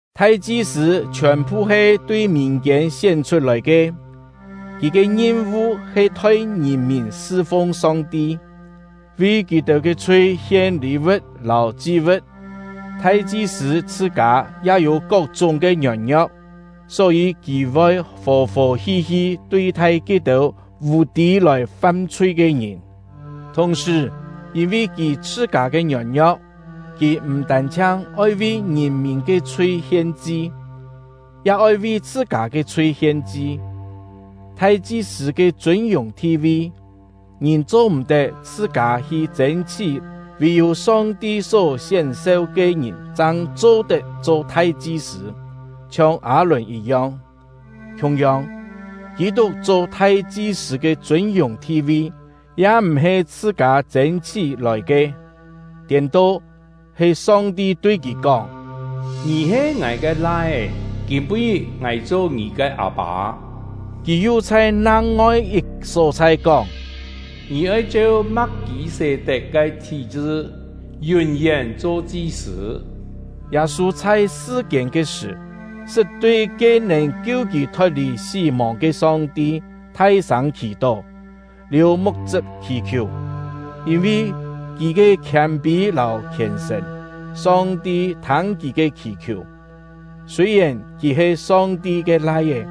Thai-chi-sṳ̂ chhiòn-phu he tui mìn-kiên sién-chhut-lòi ke; kì ke ngim-vu he thoi ngìn-mìn sṳ-fung Song-ti, vi kì-têu ke chhui hien lî-vu̍t lâu chi-vu̍t. Thai-chi-sṳ̂ chhṳ-kâ ya yû kok-chúng ke ngiôn-ngio̍k, só-yî kì voi fò-fò hi-hi tui-thai ke-têu vù-tî lòi fam-chhui ke ngìn. Thùng-sṳ̀, yîn-vi kì chhṳ-kâ ke ngiôn-ngio̍k, kì m̀ tân-chhiang oi vi ngìn-mìn ke chhui hien-chi, ya oi vi chhṳ-kâ ke chhui hien-chi. Thai-chi-sṳ̂ ke chûn-yùng thi-vi, ngìn cho-m̀-tet chhṳ-kâ hi chên-chhí; vì-yû Song-ti só sién-seu ke ngìn chang cho-tet cho thai-chi-sṳ̂, chhiong Â-lùn yit-yong. Khiung-yong, Kî-tuk cho thai-chi-sṳ̂ ke chûn-yùng thi-vi ya m̀-he chhṳ-kâ chên-chhí lòi ke; tiên-to, he Song-ti tui kì kóng: Ngì he Ngài ke Lai-é; kîm-pû-ngit Ngài cho ngì ke Â-pâ. Kì yu chhai nang-ngoi yit só-chhai kóng: Ngì oi cheu Ma̍k-kî-sé-tet ke thí-chṳ, yún-yén cho chi-sṳ̂. Yâ-sû chhai sṳ-kiên ke sṳ̀, sṳt tui ke nèn kiu kì thot-lì sí-mòng ke Song-ti thai-sâng khì-tó, liù muk-chṳp khì-khiù. Yîn-vi kì ke khiâm-pî lâu khièn-sṳ̀n, Song-ti thâng kì ke khì-khiù. Sûi-yèn kì he Song-ti ke Lai-é,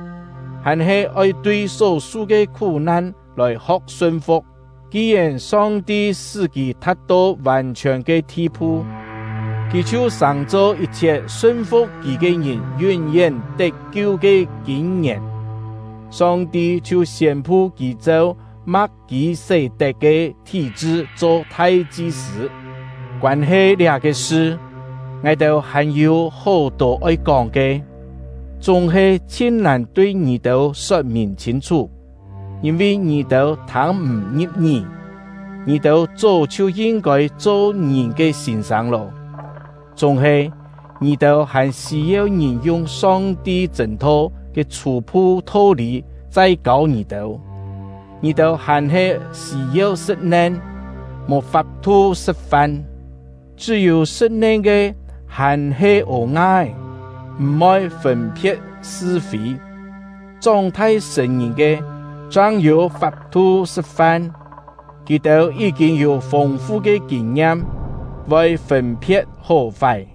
hàn-he oi tui só-su ke khú-nan lòi ho̍k sun-fu̍k. Ki-yèn Song-ti sṳ́ kì tha̍t-to vàn-chhiòn ke thi-phu, kì chhiu sàng-cho yit-chhiet sun-fu̍k kì ke ngìn yún-yén tet-kiu ke kîn-ngièn; Song-ti chhiu siên-pu kì cheu Ma̍k-kî-sé-tet ke thí-chṳ cho thai-chi-sṳ̂. Koân-he liá-ke sṳ, ngài-têu hàn-yû hó-tô oi kóng ke, chúng-he chhin-nàn tui ngì-têu sot-mìn chhîn-chhú, yîn-vi ngì-têu thâng m̀ ngi̍p-ngí. Ngì-têu chó chhiu yin-kôi cho ngìn ke sîn-sâng lô, chúng-he ngì-têu hàn sî-yeu ngìn yung Song-ti chṳ̂n-tho ke chhû-phu tho-lî chai kâu ngì-têu; ngì-têu hàn-he sî-yeu sṳ̍t-nen, mò fap-thu sṳ̍t-fan. Chṳ́-yû sṳ̍t-nen ke hàn-he ô-nga-é, m̀-voi fûn-phe̍t sṳ-fî. Chóng-thai sṳ̀n-ngìn ke chang yû fap-thu sṳ̍t-fan; kì-têu yí-kîn yû fûng-fu ke kîn-ngiam, voi fûn-phe̍t hó-fái.